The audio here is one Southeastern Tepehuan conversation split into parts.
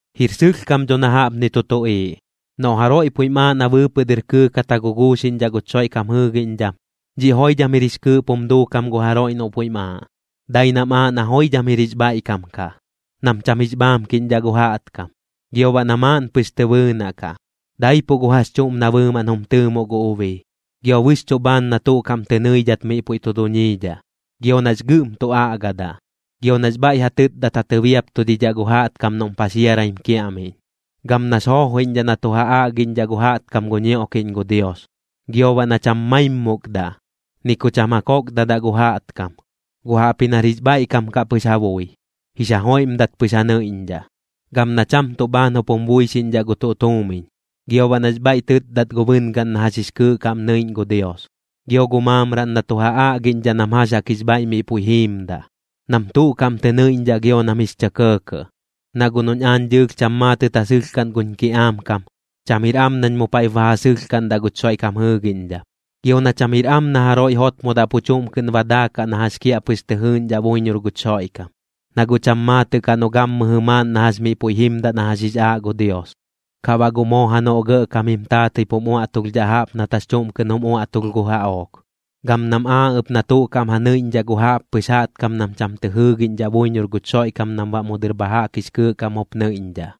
Jir sɨlhkam dho na jaꞌpni tu tuꞌiiꞌ: Noꞌ jaroiꞌ puiꞌm aaꞌ na bɨɨpɨꞌ dɨr kɨɨkat ja guguuxiꞌñdhaꞌ guch Xoiꞌkam jɨɨgiꞌñdham, dhiꞌ joidham jir jix kɨɨꞌp jum duukam gu jaroiꞌ noꞌ puiꞌm aaꞌ. Dai nam aaꞌ na joidham jir jix bhaiꞌkam kaꞌ, nam cham jix bhaamkiꞌñdhaꞌ gu jaꞌtkam. Gio baꞌ na maaꞌn pɨx tɨ bɨɨnaꞌ kaꞌ, daipuꞌ gu jax chuꞌm na bɨɨmaꞌn jum tɨɨmoꞌ gu ubii. Gio bɨxchuꞌ bhaan na tuꞌ kaꞌm tɨ nɨidhat miꞌ pu tu duñiidhaꞌ, gio nax gɨꞌm tu aꞌgadaꞌ. Gam nax bhaiꞌ ja tɨtdat ja tɨbiaptudidhaꞌ gu jaꞌtkam noꞌm paxiaraim kiaꞌmiꞌñ. Gam nax joojoiꞌñdhaꞌ na tu ja aꞌgiꞌñdhaꞌ gu jaꞌtkam gu ñioꞌkiꞌñ gu Dios. Gio baꞌ na cham maimmukdaꞌ, ni ku cham ja kokdadaꞌ gu jaꞌtkam, guꞌ jaꞌpji nar jix bhaiꞌkam kaꞌ pɨx ja bui, jix ja joiꞌmdat pɨx ja nɨiꞌñdhaꞌ. Gam na cham tuꞌ bhaan jup jum buixiꞌñdhaꞌ gu tuꞌ tuumiñ. Gio baꞌ nax bhaiꞌ tɨtdat gu bɨngaꞌn na jax jix kɨɨꞌ kaꞌm nɨiꞌñ gu Dios, gio gu maamraꞌn na tu ja aꞌgiꞌñdhaꞌ nam jax jaꞌk jix bhaiꞌ miꞌ puiꞌ jiimdaꞌ, nam tuꞌ kaꞌm tɨ nɨiꞌñdhaꞌ gio nam jix chɇ kɇɇkɇꞌ. Na guꞌ noꞌñ aañ dɨɨlh cham maatɨt ja sɨlhkaꞌn guñ kiꞌaam kam, cham jir am nañ mu paiꞌp ba ja sɨlhkaꞌndaꞌ guch Xoiꞌkam jɨɨgiꞌñdham. Gio na cham jir am na jaroiꞌ jotmodaꞌ pu chuꞌm kɨꞌn ba daakaꞌ na jax kiaꞌpɨx tɨ jɨɨꞌñdhaꞌ buiñor guch Xoiꞌkam. Na guꞌ cham maatɨꞌ kaꞌ noꞌ gammɨjɨ maaꞌn na jax miꞌ puiꞌ jimdaꞌ na jax jix aaꞌ gu Dios, kaꞌ baꞌ guꞌ moo janoꞌ gɇꞌkam jim taatɨi pum uaꞌtulhdhaꞌ jaꞌp nat jax chuꞌm kɨꞌn jum uaꞌtulh gu jaꞌook. Gam nam aaꞌ ɨp na tuꞌ kaꞌm ja nɨiꞌñdhaꞌ gu jaꞌppɨx jaꞌtkam nam cham tɨ jɨɨgiꞌñdhaꞌ buiñor guch Xoiꞌkam nam baꞌ mu dɨr bha jaꞌk jix kɨɨꞌ kaꞌm jup nɨiꞌñdhaꞌ,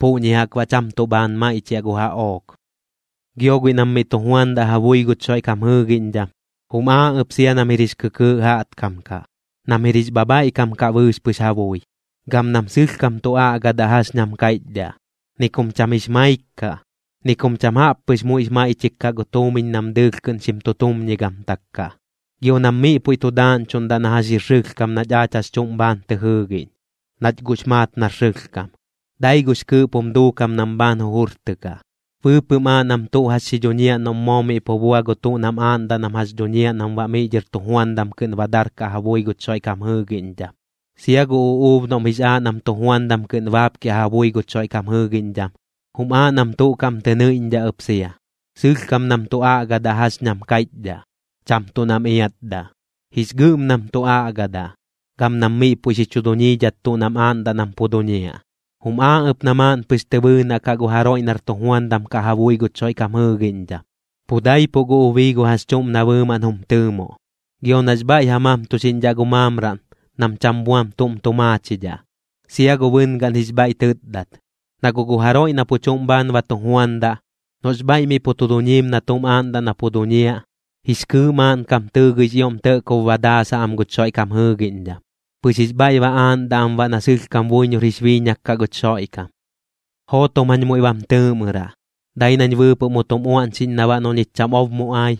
puꞌñi jaꞌk baꞌ cham tuꞌ bhaan maiꞌchiaꞌ gu jaꞌook. Gio guiꞌ nam miꞌ tu juandaꞌ ja bui guch Xoiꞌkam jɨɨgiꞌñdham, jum aaꞌ ɨp sia nam jir jix kɨkɨɨꞌ jaꞌtkam kaꞌ, nam jir jix bhabhaiꞌkam kaꞌ bɨɨx pɨx ja bui. Gam nam sɨlhkam tu aꞌgadaꞌ jax ñam kaiꞌchdhaꞌ. Ni kum cham jix maik kaꞌ. Ni kum cham jaꞌp pɨx muiꞌx maiꞌchik kaꞌ gu tuumiñ nam dɨɨlh kɨꞌn xim tu tumñigamtak kaꞌ. Gio nam miꞌ puiꞌ tu daaꞌñchuꞌndaꞌ na jax jir sɨlhkam nach aach jax chuꞌm bhaan tɨ jɨɨgiꞌñ, nach guꞌx maat nar sɨlhkam, dai gux kɨɨꞌp jum duukam nam bhaan jujurtɨkaꞌ. Bɨɨpɨꞌm aaꞌ nam tuꞌ jax xi dhuñiaꞌ noꞌm moo miꞌ pu bua gu tuꞌ nam aaꞌndaꞌ nam jax dhuñiaꞌ nam baꞌ miꞌ dhɨr tujuandam kɨꞌn ba darkaꞌ ja bui guch Xoiꞌkam jɨɨgiꞌñdham. Sia gu uꞌuub noꞌm jix aaꞌ nam tujuandam kɨꞌn baapkiaꞌ ja bui guch Xoiꞌkam jɨɨgiꞌñdham, jum aaꞌ nam tuꞌ kaꞌm tɨ nɨiꞌñdhaꞌ ɨp sia. Sɨlhkam nam tu aꞌgadaꞌ jax ñam kaiꞌchdhaꞌ, cham tuꞌ nam iatdaꞌ. Jix gɨꞌm nam tu aꞌgadaꞌ, gam nam miꞌ puiꞌ xi chu dhuñiidhat tuꞌ nam aaꞌndaꞌ nam pu duñiaꞌ. Jum aaꞌ ɨp na maaꞌn pɨx tɨ bɨɨnaꞌ kaꞌ gu jaroiꞌ nar tujuandam kaꞌ ja bui guch Xoiꞌkam jɨɨgiꞌñdham, pu daipuꞌ gu ubii gu jax chuꞌm na bɨɨmaꞌn jum tɨɨmoꞌ. Gio nax bhaiꞌ ja mamtuxiꞌñdhaꞌ gu maamraꞌn, nam cham buam tuꞌm tu maachidhaꞌ, sia gu bɨngaꞌn jix bhaiꞌ tɨtdat. Na guꞌ gu jaroiꞌ na pu chuꞌm bhaan ba tu juandaꞌ, noꞌx bhaiꞌ miꞌ pu tu duñiim na tuꞌm aaꞌndaꞌ na pu duñiaꞌ, jix kɨɨꞌ maaꞌnkam tɨɨgɨix ioꞌm tɇꞌkob ba daasaꞌ am guch Xoiꞌkam jɨɨgiꞌñdham, pɨx jix bhaiꞌ ba aaꞌndaꞌ am baꞌ na sɨlhkam buiñor jix biiñak kaꞌ guch Xoiꞌkam. Jootom jañ muiꞌ bam tɨɨꞌmɨraꞌ, dai nañ bɨɨpɨꞌ mu tum uaꞌñxiꞌñ na baꞌ noꞌ ñich cham ob mu ai,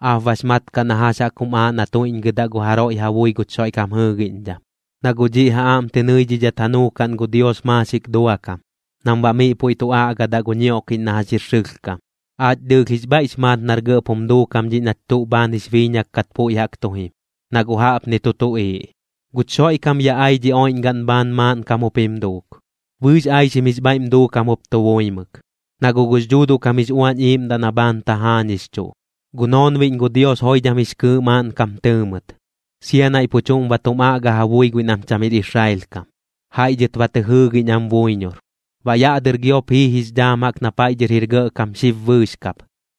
aap bax mat kaꞌ na jax jaꞌk jum aaꞌ na tuiꞌñgɨdaꞌ gu jaroiꞌ ja bui guch Xoiꞌkam jɨɨgiꞌñdham. Na guꞌ dhiꞌ ja aꞌm tɨ nɨidhat ja nuukaꞌn gu Dios maaxik duakam, nam baꞌ miꞌ puiꞌ tu aꞌgadaꞌ gu ñioꞌkiꞌñ na jax jir sɨlhkam. Aach dɨɨlh jix bhaiꞌx maat nar gɇꞌp jum duukam dhiꞌ nach tuꞌ bhaan jix biiñak kat puiꞌ jaꞌk tu jim, na guꞌ jaꞌpni tu tuꞌiiꞌ: Guch Xoiꞌkam ya ai dhi oiꞌñgaꞌn bhaan maaꞌnkam jup jim duuk. Bɨɨx aixim jix bhaiꞌm duukam jup tu buimɨk, na guꞌ gux Dhuuduꞌ kam jix Uañ Iiꞌmdaꞌ na bhaan tajaañixchuꞌ. Gu noonbiꞌñ gu Dios joidham jix kɨɨꞌ maaꞌnkam tɨɨ mɨt, sia naiꞌ pu chuꞌm ba tum aꞌga ja bui guiꞌ nam cham jir Israel kam, jaiꞌ dhɨt ba tɨ jɨɨgiꞌñ am buiñor. Baꞌ yaꞌ dɨr giop jii jix dhaam jaꞌk na paiꞌ dhɨr jir gɇꞌkam xib bɨɨx kap.